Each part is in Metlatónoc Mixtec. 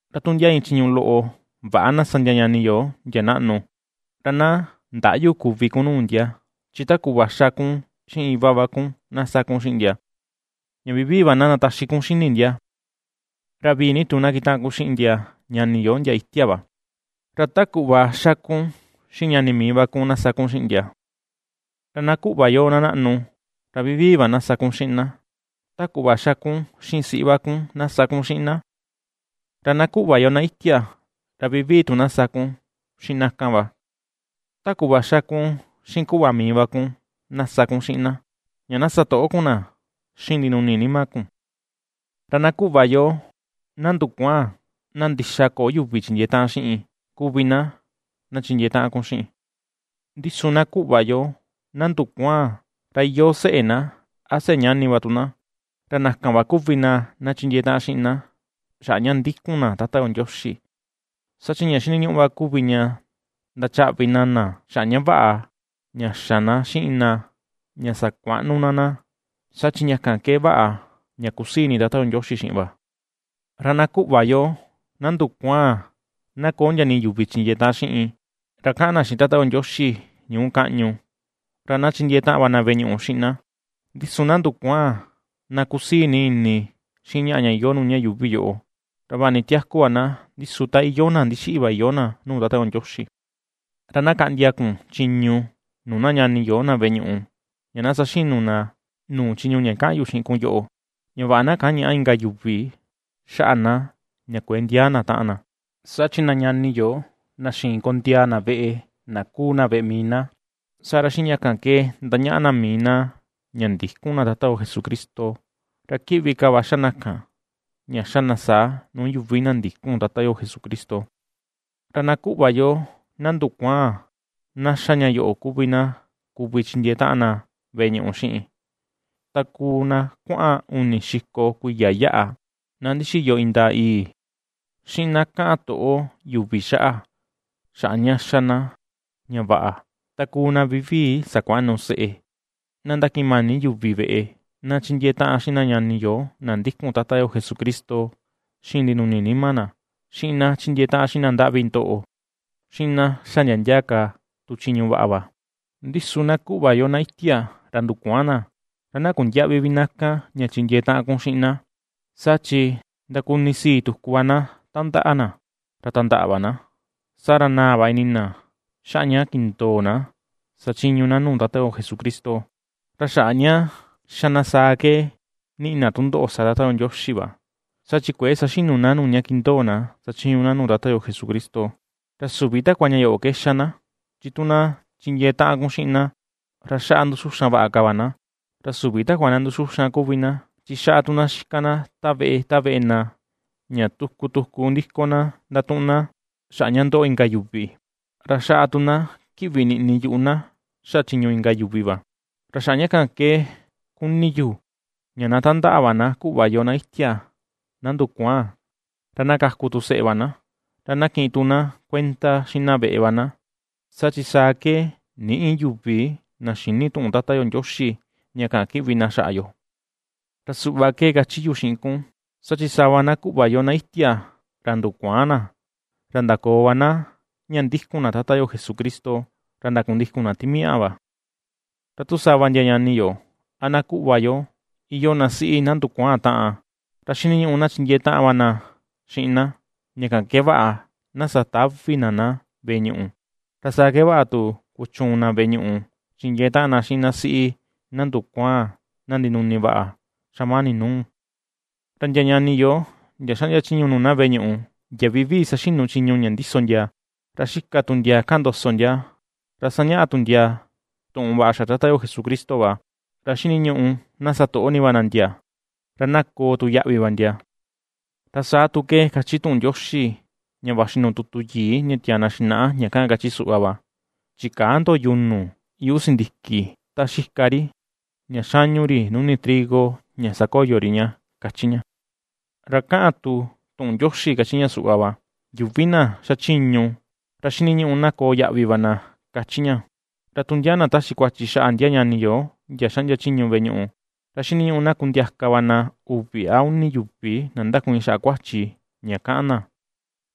Ra tu ndia iin chiñu loꞌo väꞌa na sa ndia ñani yo, ndia naꞌnu, ra na ndäꞌyu kuvi kun nuu ndia, chi ta kuꞌva ^xa kun xiꞌin iva va kun, na sa kun xiꞌin ndia, ña vivii va na ndataxi kun xini ndia. Ra vii ni tu na kitaꞌan kun xiꞌin ndia ñani yo ndia itia va, ra ta kuꞌva xa kun xiꞌin ñani mii va kun na sa kun xiꞌin ndia. Ra na kuꞌva yo na naꞌnu, ra vivii va na sa kun xiꞌin na, ta kuꞌva ^xa kun xiꞌin siꞌi va kun na sa kun xiꞌin na. Ra na kuꞌva yo na itia, ra vivii tu na sa kun xiꞌin na kan va, ta kuꞌva ^xa kun xiꞌin kuꞌva mii va kun, na sa kun xiꞌin na; ña na satoꞌo kun na xiꞌin ndinuni nima kun. Ra na kuꞌva yo na ndukuaan, na ndixa köo yuvi chindiee taꞌan xiꞌin kuvi na, na chindiee taꞌan kun xiꞌin. Ndi su na kuꞌva yo na ndukuaan ra iyoo seꞌe na, a seꞌe ñani va tu na, ra na kan va kuvi na̱, na chindiee taꞌan xiꞌin ná xaꞌa ña ndikun na Tata yo Ndioxi. Saa chi ña xiniñuꞌu va kuvi ña ndachaꞌvi na na xaꞌa ña vaꞌa, ña xa ná xiꞌin na ña sakuaꞌnu ná na̱, saa chi ña kan ke vaꞌa ña kusii ini Tata yo Ndioxi xiꞌin va. Ra na kuꞌva yo, na ndukuaan, na köo ndia nii yuvi chindiee taꞌan xiꞌin, ra kaꞌan na xiꞌin Tata yo Ndioxi ñuu kaꞌñu, ra na chindiee taꞌan na veꞌe ñuꞌu xiꞌin na. Ndi su na ndukuaan, na kusii ni ini xiꞌin ñaꞌa ña iyoo nuu ña yuuvi yoꞌo, ra vaꞌa ni tiaku va na, ndi su ta iyoo na ndixiꞌi va iyoo na nuu Tata yo Ndioxi. Ra na kaꞌndia kun chiñu nuu na ñani yo na veꞌe ñuꞌu ña na saxinu na nuu chiñu ña kaꞌan yu xiꞌin kun yoꞌo, ña vaꞌa na kañäꞌa inka yuvi xaꞌa na ña kuëe ndiaa na taꞌan na. Saa chi na ñani yo na xïin kondiaa na veꞌe, na kuu na veꞌe mii na, saa ra xiꞌin ña kan ke ndañaꞌa na mii na ña ndïkun ka na Tata yo Jesucristo, ra kiꞌvi ka va xa na kan, ña xa na saa, nuu yuvi na ndïkun Tata yo Jesucristo. Ra na kuꞌva yo, na ndukuaan, na xa ña yoꞌo kuvi na kuvi chindiee taꞌan na veꞌe ñuꞌu xiꞌin: ta kuu na kuaꞌan uni xiko kuiya yaꞌa, na ndixiyo indaa yii, xiꞌin na kaꞌan toꞌo yuvi xaꞌa, xaꞌa ña ^xa na ña vaꞌa; ta kuu na vivii sakuaꞌnu seꞌe, na ^ndakiꞌin mani yuvi veꞌe, na ^chindiee taꞌan xiꞌin na ñani yo na ndikun Tata yo Jesucristo xiꞌin ndinuni nima na, xiꞌin na ^chindiee taꞌan xiꞌin na ndaꞌvi ndoꞌo, xiꞌin na ^xa ndia ndia ka tu chiñu vaꞌa va. Ndi su na kuꞌva yo, na itia, ra ndukuaan na, ra na kundiäꞌvi vi na kan, ña chindiee taꞌan vi kun xiꞌin na, saa chi ndakunisii tuku va na tandaꞌa na, ra tandaꞌa va na, saa ra naa va ini na xaꞌa ña kindoo na sachiñu na nuu Tata yo Jesucristo. Ra xaꞌa ña ^xa na saa ke niꞌi na tundoꞌo sa Tata yo Ndioxi va, saa chi kuëe saxinu na nuu ña kindoo na sachiñu na nuu Tata yo Jesucristo. Ra süvi takua ña yoꞌo ke ^xa na, chi tu na chindiee taꞌan kun xiꞌin na, ra xaꞌa ^nduxuxan vaꞌa ka va na, ra süvi takua na ^nduxuxan kuvi na, chi xaꞌa tu na ña xika na ta veꞌe, ta veꞌe na, ña tuku tuku ndiko na ndatuꞌun na xaꞌa ña ndoꞌo inka yuvi, ra xaꞌa tu na kiꞌvi niꞌni yuꞌu na xaꞌa chiñu inka yuvi va. Ra xaꞌa ña kan ke ^kuni yu, ña na tandaꞌa va na kuꞌva yo na itia, na ndukuaan, ra na kaku tu seꞌe va na, ra na kiꞌin ni tu na kuenda xiꞌin na veꞌe va na, saa chi saa ke nïꞌi yuvi na xïni tuꞌun Tata yo Ndioxi ña kaꞌan kiꞌvi na xaꞌa yo. Ra suꞌva ke kachi yu xiꞌin kun, saa chi sava na kuꞌva yo, na itia ra ndukuaan na, ra ndakoo va na ña ndikun na Tata yo Jesucristo, ra ndakundikun na timiaꞌa va. Ra tu sava ndia ñani yo, a na kuꞌva yo, iyoo na siꞌi na ndukuaan taꞌan, ra xiniñuꞌu na chindiee taꞌan va na xiꞌin na, ña kan ke vaꞌa na satävi na na veꞌe ñuꞌu; ra saa ke vaꞌa tu kuchuun na veꞌe ñuꞌu chindiee taꞌan na xiꞌin na siꞌi na ndukuaan, na ndinuni vaꞌa xamani nuu. Ra ndia ñani yo, ndia xaꞌndia chiñu nuu na veꞌe ñuꞌu ndia vivii saxinu chiñu ña ndiso ndia, ra xika tu ndia kaꞌan ndoso ndia, ra sañaꞌa tu ndia tuꞌun vaꞌa xaꞌa Tata yo Jesucristo va, ra xiniñuꞌu na satoꞌo ni va na ndia, ra na koo tu yaꞌvi va ndia. Ra saa ke kachi tu tuꞌun Ndioxi ña vaxi nuu tutu yii ña tiaa na xinaꞌa ña kaꞌan kachi suꞌva va: “Chikäa ndo yunu yuꞌu sindiki ta xika ri, ña xañu ri nuni trigo ña sakoyo ri ña”, kachi ña. Ra kaꞌan tu tuꞌun Ndioxi kachi ña suꞌva va: “Yuvi na xachiñu, ra xiniñuꞌu na koo yaꞌvi va na”, kachi ña. Ra tu ndia na taxi kuachi xaꞌa ndia ñani yo ndia xaꞌndia chiñu veꞌe ñuꞌu, ra xiniñuꞌu na kundiaka va na uvi a uni yuvi na ndakuiin xaꞌa kuachi ña kaꞌan na,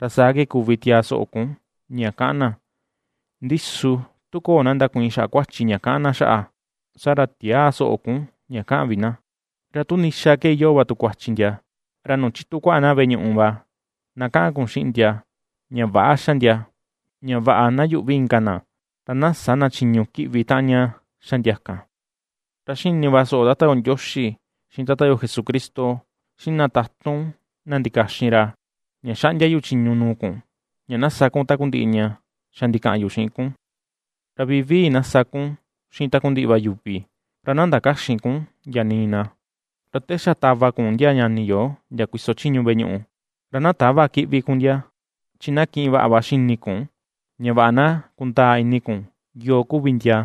ra saa ke kuvi tiaa soꞌo kun ña ^kaꞌan na, ndi su tu köo na ndakuiin xaꞌa kuachi ña kaꞌan na xaꞌa, saa ra tiäa soꞌo kun ña kaꞌan vi na. Ra tu ndixa ke iyoo va tu kuachi ndia, ra nuu chitu kuaꞌa na veꞌe ñuꞌu va, na kaꞌan kun xiꞌin ndia ña väꞌa ^xa ndia, ña vaꞌa na yuꞌvi inka na, ra na sä na chiñu kiꞌvi taꞌan ña ^xa ndia kan. Ra ^xini va soꞌo Tata yo Ndioxi, xiꞌin Tata yo Jesucristo, xiꞌin na tatun na ndikaxin ra, ña xaꞌndia yu chiñu nuu kun ña na sa kun takundiꞌi ña xa ndikaꞌan yu xiꞌin kun, ra vivii na sa kun xiꞌin takundiꞌi va yuvi, ra na ndakäxin kun ndia nii na. Ra te xa tava kun ndia ñani yo ndia kuiso chiñu veꞌe ñuꞌu, ra na täva kiꞌvi kun ndia, chi na kiꞌin vaꞌa va xini kun ña vaꞌa na kundaa ini kun yoo kuvi ndia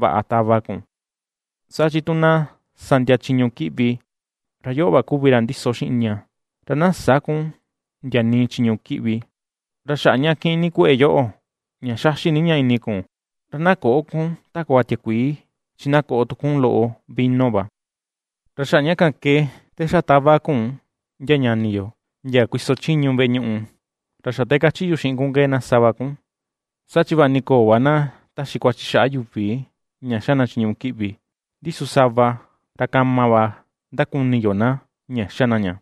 vaꞌa tava kun, saa chi tu na sa ndia chiñu kiꞌvi, ra yoꞌo va kuvi ra ndiso xiꞌin ña. Ra na sä kun ndia nii chiñu kiꞌvi. Ra xaꞌa ña kiꞌin ni kueꞌe yoꞌo, ña xaxi ni ña ini kun, ra na köꞌo kun takua tiakuii, chi na koꞌo tu kun loꞌo vino va. Ra xaꞌa ña kan ke te xa tava kun ndia ñani yo, ndia kuiso chiñu veꞌe ñuꞌu, ra xa te kachi yu xiꞌin kun ke na sa va kun, saa chi vaꞌa ni köo va na taxi kuachi xaꞌa yuvi ña ^xa na chiñu kiꞌvi, ndi su sava, ra kama va ndakuni yo na ña ^xa na ña,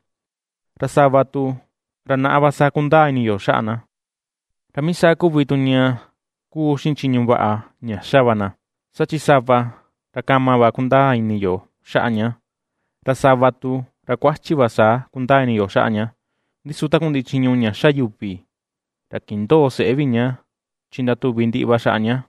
ra sava tu, ra naꞌa va saa kundaa ini yo xaꞌa na. Ra mii saa kuvi tu ña kuu xiꞌin chiñu vaꞌa ña xa va na, saa chi sava, ra kama va kundaa ini yo xaꞌa ña, ra sava tu ra kuachi va saa kundaa ini yo xaꞌa ña, ndi su takundiꞌi chiñu ña ^xa yuvi ra kindöo seꞌé ña, chi ndatuvi ndiꞌi va xaꞌa ña.